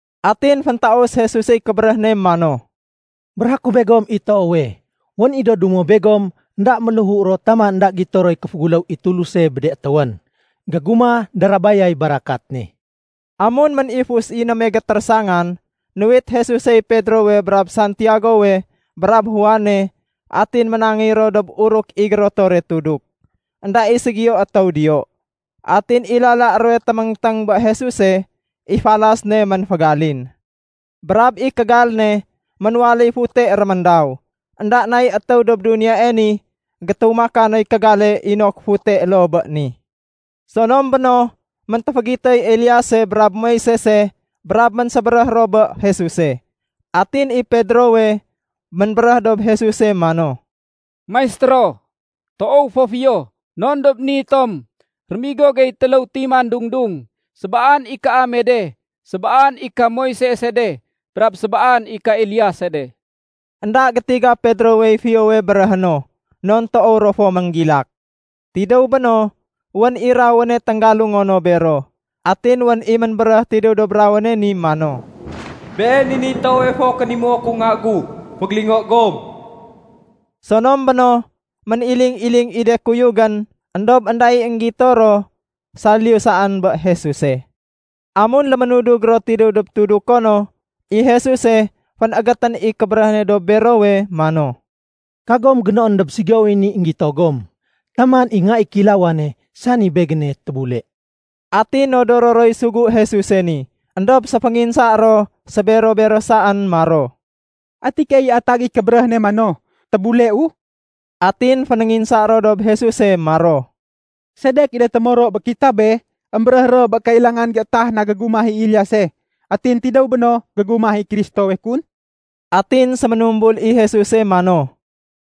Atin féntaus Jesusey kébéréh ne mano, “Béréhé ku begom i toowe, wén i do dumo begom énda méléhu ro taman énda gito roy kéféguléw i Tuluse bé de étéwén, gégumah darabayay barakat ne.” Amun ménifus i néme gétérésangan, nuwit Jesusey Pedrowe brab Santiagowe brab Juane, atin ménangéy ro dob uruk i gérotore tuduk, énda i ségiyo étéw diyo. Atin i lala ruwe téméngténg bé Jesuse, i falas ne ménfégalin. Brab i kégal ne ménwaléy fute réméndaw. Enda nay étéw dob duniyae ni gétumaka noy kégale inok fute loo bé ni. Sonom béno, méntéfégitoy Eliase brab Moisese brab ménsébéréh ro bé Jesuse. Atin i Pedrowe ménbéréh dob Jesuse mano, “Maistéro, toow fo fiyo non dob ni tom. Rémigo gey téléw timan dung-dung. Sébaan i kaame de, sébaan i ka Moisese de, brab sébaan i ka Eliase de.” Enda gétiga Pedrowey fiyowe béréhé no non toow ro fo ménggilak. Tidéw béno, wén i rawéne ténggalungo no bero. Atin wén i ménbéréh tidéw dob rawéne ni mano, “Been i niy toowe fo kénimuo ku Nga gu. Fégélingo gom.” Sonom béno, méniling-iling i de kuyugén éndob énda i énggito ro saliyu saén bé Jesuse. Amun léménudug ro tidéw dob tuduko no, i Jesuse fénégétén i kébéréh ne dob berowe mano, “Kagom génoén dob ségiyowey ni énggito gom taman i Nga i Kéilawane, sani Begéne tébule.” Atin nodoro roy sugu Jesuse ni éndob séfénginsa ro sébero-bero saén maro, “Ati keey i atag i kébéréh ne mano, ‘Tébuleu?’” Atin fénénginsa ro dob Jesuse maro, “Sedek i de témoro bé kitabe émbéréh ro bé kailangan géétah na gégumah i Eliase, atin tidéw béno gégumah i Kristowe kun?” Atin séménumbul i Jesuse mano,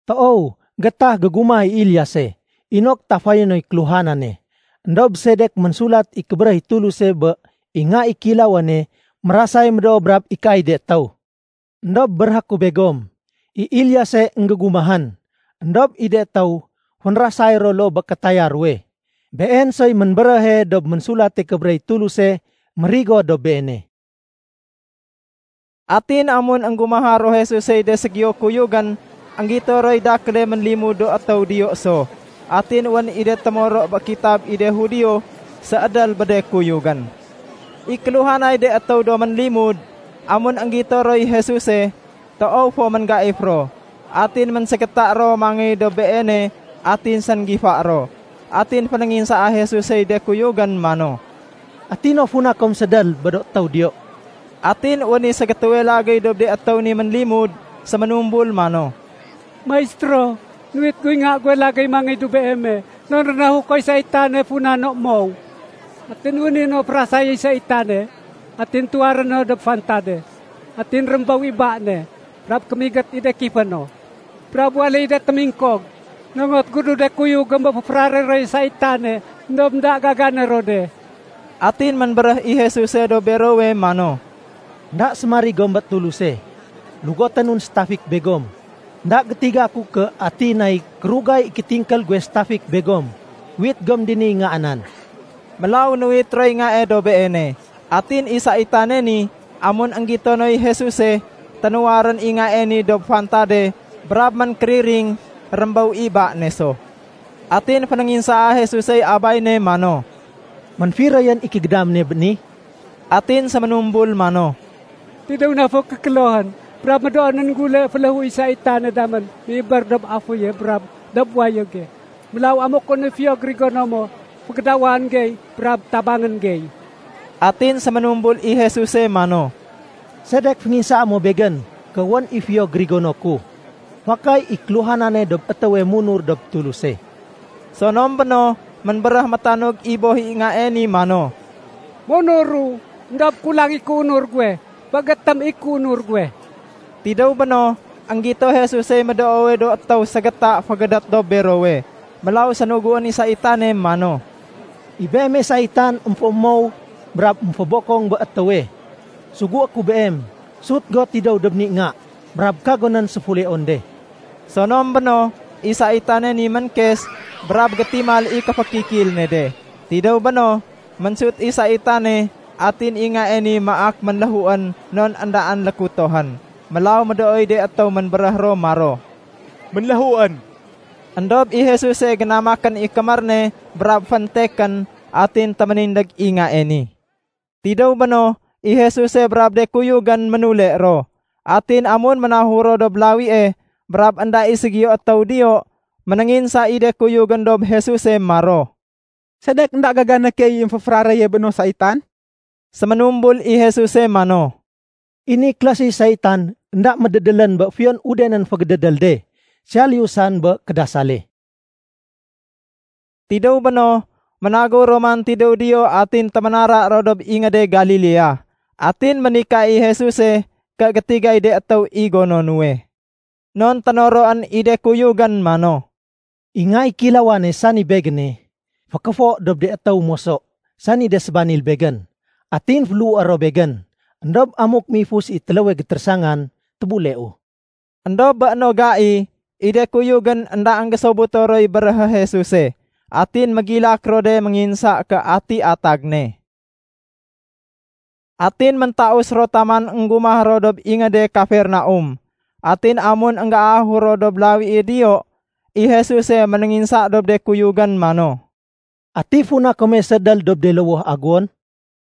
“Toow, géétah gégumah i Eliase inok tafayé noy kéluhanane. Endob sedek ménsulat i kébéréh i Tuluse bé i Nga i Kéilawane mérasay médoo brab ikaay de étéw? Endob béréhé ku begom, i Eliase énggégumahén, éndob i de étéw fénrasay ro loo bé kétaya ruwe. Been soy ménbéréhe dob Ménsulate Kébéréh i Tuluse mérigo dob beene.” Atin amun énggumaha ro Jesusey de ségiyo kuyugén, énggito roy dakéle ménlimud do étéw diyo so. Atin wén i de témoro bé kitab i de Judio séédél bé de kuyugén. I kéluhanay de étéw do ménlimud, amun énggito roy Jesuse, toow fo ménggaif ro, atin ménségéta ro mangéy dob Beene atin sénggifa ro. Atin fénénginsaa Jesusey de kuyugén mano, “Ati no funa kom séédél bé do étéw diyo?” Atin wén i ségétéwe lagéy dob de étéw ni ménlimud séménumbul mano, “Maistéro, nuwit guy nga guwe lagéy mangéy dob Beeme, non rénahukoy saitane funa no mow. Atin wén i no férasayéy saitane, atin tuwaré no dob fantade. Atin rémbéw i ba ne, brab kémigét i de kifé no, brab waléy de témingkog. Nongot gu bé de kuyugém bé féféraréyé roy saitane, éndob énda gagané ro de.” Atin ménbéréh i Jesuse dob berowe mano, “Enda sémarig gom bé Tuluse. Lugoténun sétafik begom. Enda gétiga ku ké ati nay kérugay i kétingkél guwe sétafik begom. Uwit gom diniy ngaa nan.” Mélaw nuwit roy ngae dob Beene. Atin i saitane ni amun énggito noy Jesuse, ténuwarén i ngae ni dob fantade brab ménkériring, rémbéw i ba ne so. Atin fénénginsaa Jesusey abay ne mano, “Ménfiroyén i kégédam ne bé ni?” Atin séménumbul mano, “Tidéw na fo kékélohén. Brab médoonén gule féléhuéy saitane damén méibér dob aféye brab dob wayége. Mélaw amuk wén i fiyo gérigono mo, fégédawan gey brab tabangén gey.” Atin séménumbul i Jesuse mano, “Sedek fénginsaa mo Begén ké wén i fiyo gérigono ku? Fakay i kéluhanane dob étéwe munur dob Tuluse.” Sonom béno, ménbéréh métanug i boh i ngae ni mano, “Munuru, éndob kulang i kéunur guwe. Féégétém i kéunur guwe.” Tidéw béno, énggito Jesusey médoowe do étéw ségéta fégédét dob berowe. Mélaw sénuguén i saitane mano, “I beeme saitan émfémow brab émfébokong bé étéwe. Sugué ku beem, sut go tidéw dob ni nga, brab kagonén séfuleon de!” Sonom béno, i saitane ni ménkes, brab gétimal i kéfékikil ne de. Tidéw béno, ménsut i saitane atin i ngae ni maak ménléhuén non éndaén lékutohén. Mélaw médooy de étéw ménbéréh ro maro, “Ménléhuén.” Endob i Jesuse génamakén i kémér ne brab féntekén, atin téménindég i ngae ni. Tidéw béno, i Jesuse brab de kuyugén ménule ro. Atin amun ménahur ro dob lawie, brab énda i ségiyo étéw diyo, ménénginsa i de kuyugén dob Jesuse maro, “Sedek énda gagané key i émféféraréye bé no saitan?” Séménumbul i Jesuse mano, “I ni klase saitan, énda médédélén bé fiyon udenén fégédédél de, saliyu saén bé kédasale.” Tidéw béno, ménagéw ro man tidéw diyo atin téménara ro dob ingéde Galilea. Atin ménika i Jesuse ké gétigay de étéw i gono nuwe. Non ténoroén i de kuyugén mano, “I Nga i Kéilawane, sani Begéne, fékéfo dob de étéw moso sani de sébanil Begén. Atin féléhué ro Begén. Endob amuk méifus i téléwe gétérésangan, tébuleu.” Endob bé béno gai, i de kuyugén énda énggésobuto roy béréhé Jesuse. Atin mégilak ro de ménginsa ké ati atag ne. Atin méntaus ro taman énggumah ro dob ingéde Kafernaum. Atin amun énggérahur ro dob lawie diyo, i Jesuse ménénginsa dob de kuyugén mano, “Ati funa kome séédél dob de lowoh aguwon?”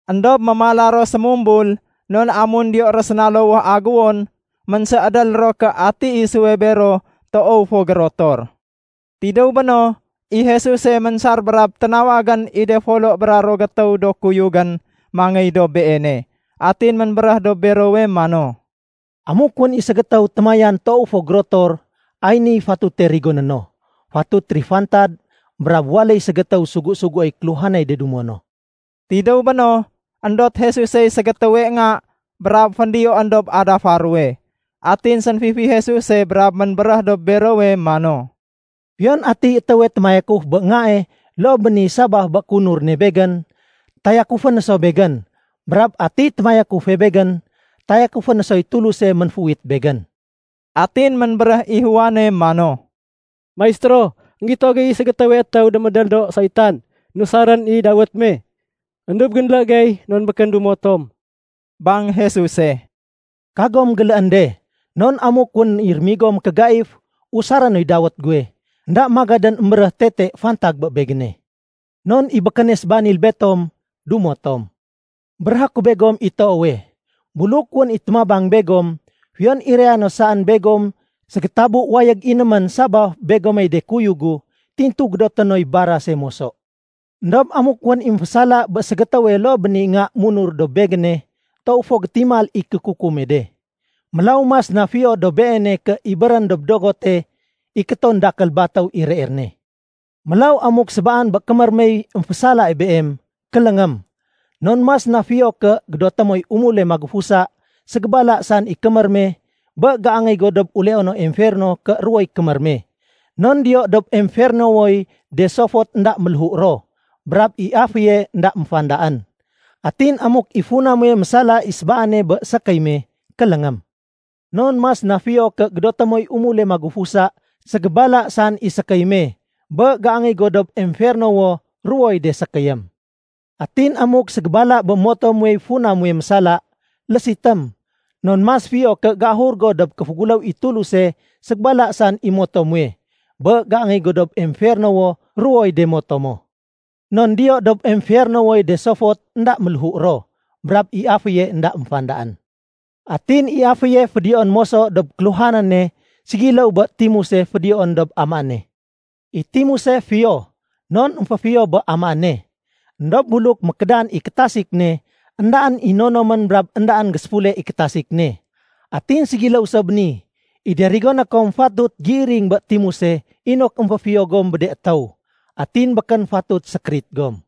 Endob mémala ro sémumbul non amun diyo ro séna lowoh aguwon, ménséédél ro ké ati isuwe bero toow fo gérotor. Tidéw béno, i Jesuse ménsar brab ténawagén i de folo bra ruwo gétéw do kuyugén mangéy dob Beene. Atin ménbéréh dob berowe mano, “Amuk wén i ségétéw témayan toow fo gérotor, ay niy fatute rigoné no. Fatut térifantad brab waléy ségétéw sugu-suguéy kéluhanay de dumo no.” Tidéw béno, éndot Jesusey ségétéwe nga brab féndiyoén dob adafa ruwe. Atin sénfifi Jesuse brab ménbéréh dob berowe mano, “Fiyon atiy étéwe témayakuf bé ngae loo bé ni sabaf bé kéunur ne Begén, tayakufé no so Begén. Brab atiy témayakufe Begén, tayakufé no soy Tuluse ménféuwit Begén.” Atin ménbéréh i Juane mano, “Maistéro, énggito gey i ségétéwe étéw démédél do saitan nusarén i dawét me. Endob génlé gey non békén dumo tom.” Bang Jesuse, “Kagom géléén de. Non amuk wén i rémigo mékégaif usaré noy dawét guwe, énda magadén émbéréh tete fantag bé Begéne. Non i békéne sébanil betom, dumo tom. Béréhé ku begom i toowe, buluk wén i témabang begom, fiyon iraya no saén begom ségétabu wayég inémén sabaf begomey de kuyug gu, tintu gédoté noy barase moso. “Endob amuk wén i émfésala bé ségétéwe loo bé ni nga munur dob Begéne, toow fo gétimal i kékukume de. Mélaw mas na fiyo dob beene ké ibérén dob dogote ikéton dakél batéw i reer ne. Mélaw amuk sébaan bé kémér mey émfésalae beem, kéléngém. Non mas na fiyo ké gédoté moy umule magufusa ségébala saén i kémér me, bé géangéy go dob uleono emferno ké ruwoy kémér me. Non diyo dob emfernowoy de sofot énda méléhu ro, brab i aféye énda méfandaén. Atin amuk i funa muwe mésala i sébaane bé sékéy me, kéléngém. Non mas na fiyo ké gédoté moy umule magufusa ségébala saén i sékéy me, bé géangéy go dob emfernowo, ruwoy de sékéyém. Atin amuk ségébala bé moto muwey funa muwe mésala, lésitém. Non mas fiyo ké géahur go dob kéféguléw i Tuluse ségébala saén i moto muwe, bé géangéy go dob emfernowo ruwoy de moto mo. Non diyo dob emfernowoy de sofot énda méléhu ro, brab i aféye énda méfandaén. “Atin i aféye fédiyoén moso dob kéluhanane ségiléw bé timuse fédiyoén dob amaéne. “I timuse fiyo, non émféfiyo bé amaéne. Endob buluk mékédan i kétasik ne, éndaén i nonomén brab éndaén géséfule i kétasik ne. Atin ségiléw so bé ni, i de rigoné kom fatut géiring bé timuse inok émféfiyo gom bé de étéw. Atin békén fatut sékérit gom.”